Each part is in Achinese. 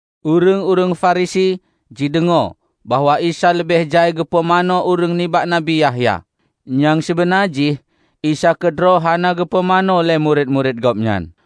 Ureuëng-ureuëng Farisi jideungoe bahwa Isa leubeh jai geupumanö ureuëng nibak Nabi Yahya. ( Nyang sibeuna jih Isa keudroe hana geupumanö lé murit-murit Gobnyan.)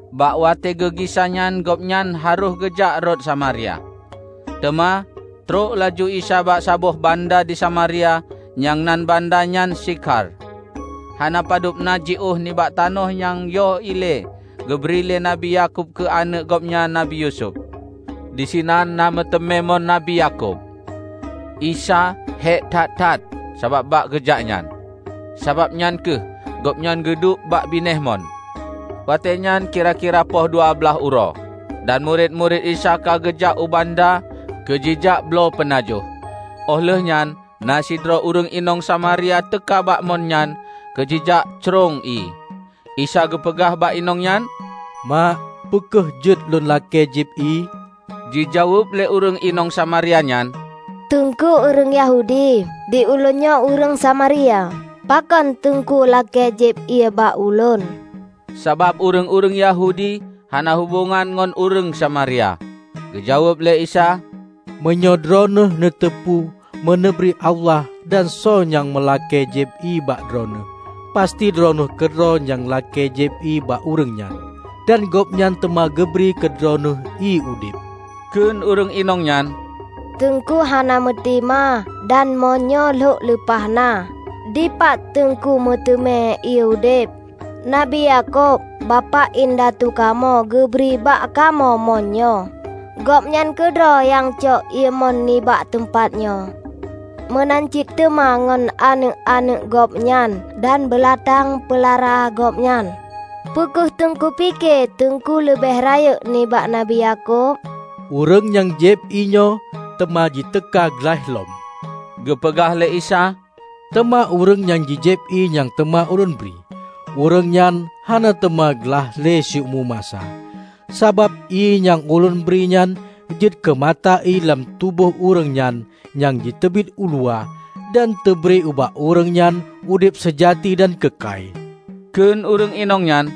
Bak watée geugisa nyan gobnyan harôh geujak rot Samaria. Teuma trok laju Isa bak saboh banda di Samaria nyang nan banda nyan Sikhar, hana padub na jiôh nibak tanoh nyang yoh ilée geubri lé Nabi Yakub keu aneuëk gobnyan Nabi Yusuf. Disinan na meuteumé mon Nabi Yakub. Isa hék that-that sabab bak geujak nyan, sababnyan kheueh gobnyan geuduek bak binéh mon. Watéenyan kira-kira poh dua blaih uroe. Dan murit-murit Isa ka geujak u banda keu jijak bloe peunajoh. Óh lheueh nyan na sidroe ureuëng inong Samaria teuka bak mon nyan keu jijak crông ié. Isa geupeugah bak inong nyan, "Mak, peu kheueh jeuet Lôn lakée jieb ié?" Jijaweueb lé ureuëng inong Samaria nyan, "Teungku ureuëng Yahudi, di ulôn nyoe ureuëng Samaria; pakon teungku lakée jieb ié bak ulôn?" (Sabab ureuëng-ureuëng Yahudi hana hubongan ngon ureuëng Samaria.) Geujaweueb lé Isa, "Meunyoe droeneueh neuteupeue meuneubri Allah dan soe nyang meulakée jieb ié bak Droeneueh, pasti droeneueh keudroe nyang lakée jieb ié bak ureuëng nyan, dan Gobnyan teuma geubri keu droeneueh ié udeb." Kheun ureuëng inong nyan, "Teungku hana meutima, dan mon nyoe lhok lumpah na. Dipat Teungku meuteumé ié udeb? Nabi Yakub, bapak indatu kamoe, geubri bak kamoe mon nyoe. Gobnyan keudroe nyang cok ié mon nibak teumpat nyoe; meunan cit teuma ngon aneuëk-aneuëk gobnyan dan beulatang peulara gobnyan. Peue kheueh Teungku pike teungku leubeh rayeuk nibak Nabi Yakub?" "Ureuëng nyang jieb ié nyoe teuma jiteuka glaih lom," geupeugah lé Isa, "teuma ureuëng nyang jijieb ié nyang teuma Ulôn bri, ureuëng nyan hana teuma glaih le siumu masa. Sabab ié nyang Ulôn bri nyan jeuet keu mata ié lam tuboh ureuëng nyan nyang jiteubiet uluwa dan teubri bak ureuëng nyan udeb seujati dan keukai." Kheun ureuëng inong nyan,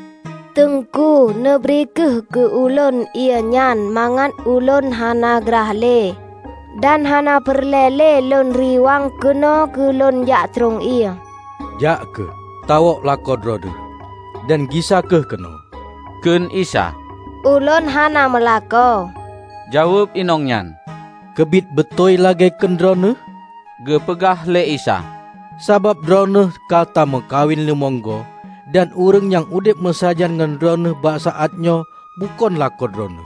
"Teungku, neubri kheueh keu ulôn ié nyan, mangat ulôn hana glaih le; dan hana peureulée le lôn riwang keunoe keu lôn jak crông ié." "Jak kheueh, tawök lakoe droeneueh, dan gisa kheueh keunoe," kheun Isa. "Ulôn hana meulakoe," Jaweueb inong nyan. "Keubiet beutôi lagée kheun droeneueh," geupeugah lé Isa. "Sabab droeneueh ka tameukawen limong go, dan ureuëng nyang udeb meusajan ngon droeneueh bak saát nyoe bukon lakoe droeneueh "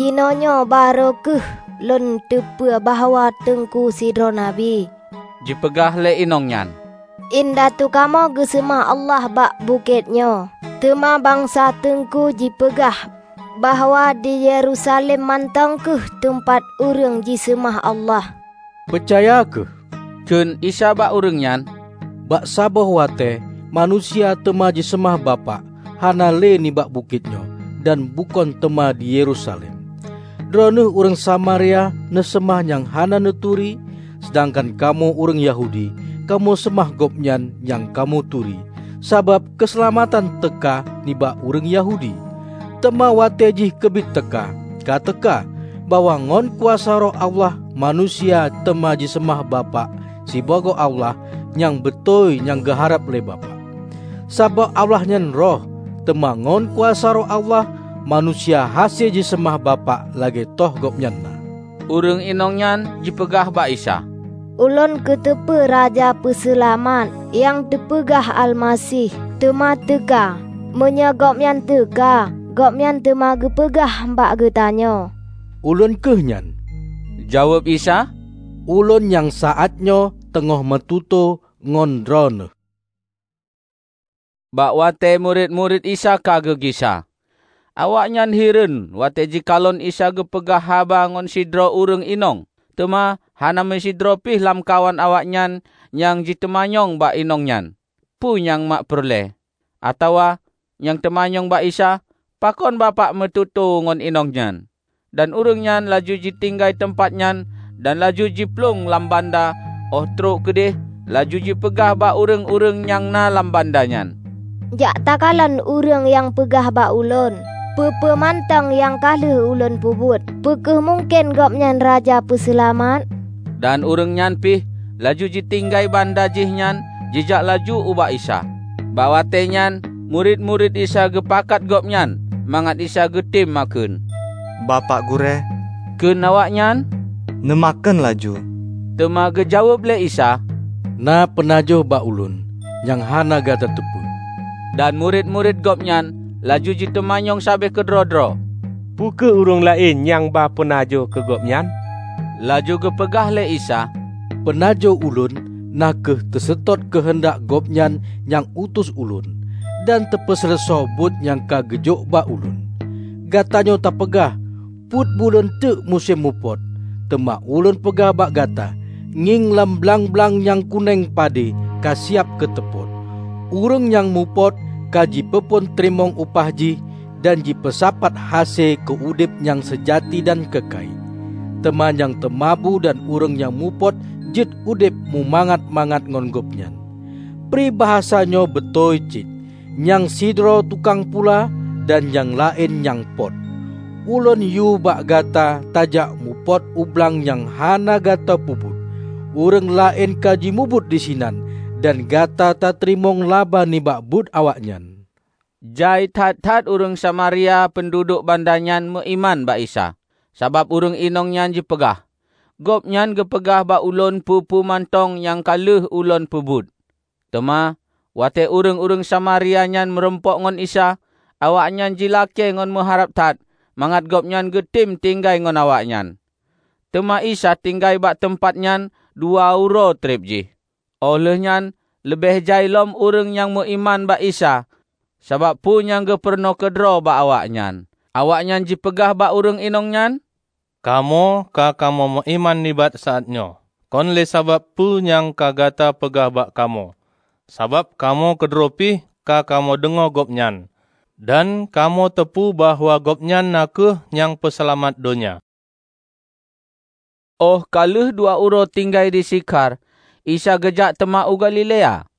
"Jinoenyoe barô kheueh lôn teupeue bahwa teungku sidroe Nabi," jipeugah le inong nyan. Indatu kamoe geuseumah Allah bak bukét nyoe, teuma bansa teungku jipeugah bahwa di Yerusalem mantong kheueh teumpat ureuëng jiseumah Allah." "Peucaya kheueh," kheun Isa bak ureuëng nyan, "bak saboh watée manusia teuma jiseumah Bapak, hana le nibak bukét nyoe, dan bukon teuma di Yerusalem. Droeneueh ureuëng Samaria neuseumah nyang hana neuturi, seudangkan kamoe ureuëng Yahudi kamoe seumah Gobnyan nyang kamoe turi, sabab keuseulamatan teuka nibak ureuëng Yahudi. Teuma watée jih keubiet teuka, ka teuka, bahwa ngon kuasa Roh Allah manusia teuma jiseumah Bapak sibagoe Allah nyang beutôi nyang geuharab lé Bapak. Sabab Allah nyan Roh, teuma ngon kuasa Roh Allah manusia hase jiseumah Bapak lagée toh Gobnyan na. Ureuëng inong nyan jipeugah bak Isa, "Ulôn kuteupeue Raja Peuseulamat (nyang teupeugah Almaseh) teuma teuka. Meunyoe Gobnyan teuka, Gobnyan teuma geupeugah bak geutanyoe." "Ulôn kheueh nyan," jaweueb Isa, "Ulôn nyang saát nyoe teungoh meututoe ngon droeneueh." Bak watée murit-murit Isa ka geugisa. Awaknyan hireuen watée jikalon Isa geupeugah haba ngon sidroe ureuëng inong. Teuma hana meusidroe pih lamkawan awaknyan nyang jiteumanyong bak inong nyan, "Peue nyang mak peureulée?" atawa nyang teumanyong bak Isa, "Pakon Bapak neumeututoe ngon inong nyan?" Dan ureuëng nyan laju jitinggai teumpat nyan dan laju jiplueng lam banda óh trok keudeh laju jipeugah bak ureuëng-ureuëng nyang na lam banda nyan, "Jak takalon ureuëng nyang peugah bak ulôn peue-peue mantong nyang ka lheueh ulôn peubuet. Peu kheueh mungken Gobnyan Raja Peuseulamat?" Dan ureuëng nyan pih laju jitinggai banda jihnyan jijak laju ubak Isa. Bak watée nyan murit-murit Isa geupakat gobnyan mangat Isa geutem makheun, "Bapak Gurée," kheun awaknyan, "Neumakheun laju." Teuma geujaweueb lé Isa, "Na peunajoh bak Ulôn, nyang hana gata teupeue." Dan murit-murit Gobnyan laju jiteumanyong sabe keudroe-droe, "Peu kheueh ureuëng laén nyang ba peunajoh keu Gobnyan?" Laju geupeugah lé Isa, "Peunajoh Ulôn na kheueh teuseutôt keuheundak Gobnyan nyang utus Ulôn, dan teupeuseuleusoe buet nyang ka geujôk bak Ulôn. Gatanyoe tapeugah, 'Peuet buleuen teuk musém mupot.' Teuma Ulôn peugah bak gata: Ngieng lam blang-blang nyang kunéng pade, ka siab keu teupot! Ureuëng nyang mupot ka jipeuphon teurimong upah jih dan jipeusapat hase keu udeb nyang seujati dan keukai. Teuma nyang teumabu dan ureuëng nyang mupot jeuet udeb mumangat-mangat ngon gobnyan. Pribasa nyoe beutôi cit, 'Nyang sidroe tukang pula, dan nyang laén nyang pot.' Ulôn yue bak gata tajak mupot u blang nyang hana gata peubuet; ureuëng laén ka jimubuet disinan, dan gata tateurimong laba nibak buet awaknyan." Jai that-that ureuëng Samaria peunduduek banda nyan meuiman bak Isa, sabab ureuëng inong nyan jipeugah, 'Gobnyan geupeugah bak ulôn peue-peue mantong nyang ka lheueh ulôn peubuet.' Teuma, watée ureuëng-ureuëng Samaria nyan meurumpok ngon Isa, awaknyan jilakée ngon meuharab that mangat Gobnyan geutem tinggai ngon awaknyan. Teuma Isa tinggai bak teumpat nyan dua uroe treb jih. Óh lheuehnyan leubeh jai lom ureuëng nyang meuiman bak Isa sabab peue nyang geupurunoe keudroe bak awaknyan. Awaknyan jipeugah bak ureuëng inong nyan, "Kamoe ka kamoe meuiman nibak saát nyoe, kon le sabab peue nyang ka gata peugah bak kamoe, sabab kamoe keudroe pih ka kamoe deungoe Gobnyan, dan kamoe teupeue bahwa Gobnyan na kheueh Nyang Peuseulamat donya." Óh ka lheueh dua uroe tinggai di Sikhar, Isa geujak teuma u Galilea.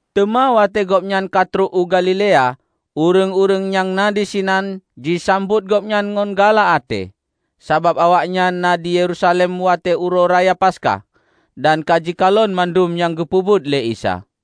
Teuma watée Gobnyan ka trok u Galilea, ureuëng-ureuëng nyang na disinan jisambot Gobnyan ngon galak até, sabab awaknyan na di Yerusalem watée Uroe Raya Paskah, dan ka jikalon mandum nyang geupeubuet lé Isa.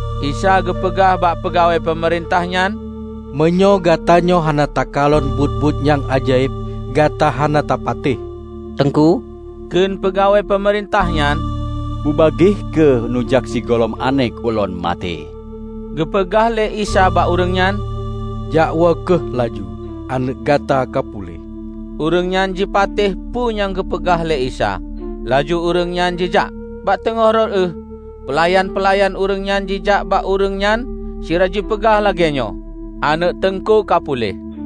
Isa geupeugah bak peugawée peumeurintah nyan, "Meunyoe gatanyoe hana takalon buet-buet nyang ajaéb, gata hana tapatéh." "Teungku," kheun peugawée peumeurintah nyan, "bubagaih kheueh neujak sigohlom aneuëk ulôn maté." Geupeugah lé Isa bak ureuëng nyan, "Jakwoe kheueh laju, aneuëk gata ka puléh." Ureuëng nyan jipatéh peue nyang geupeugah lé Isa, laju ureuëng nyan jijak. Bak teungoh rot ueh, peulayan-peulayan ureuëng nyan jijak bak ureuëng nyan sira jipeugah lagéenyoe, "Aneuëk Teungku ka puléh."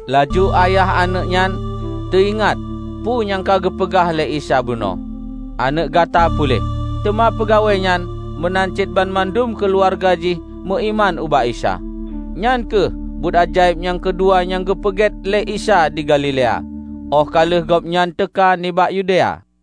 Laju ayah aneuëk nyan teuingat peue nyang ka geupeugah lé Isa bunoe, "Aneuëk gata puléh." Teuma peugawéenyan meunan cit banmandum keuluwarga jih meuiman ubak Isa. Nyan kheueh buet ajaéb nyang keudua nyang geupeubuet lé Isa di Galilea óh ka lheueh Gobnyan teuka nibak Yudea.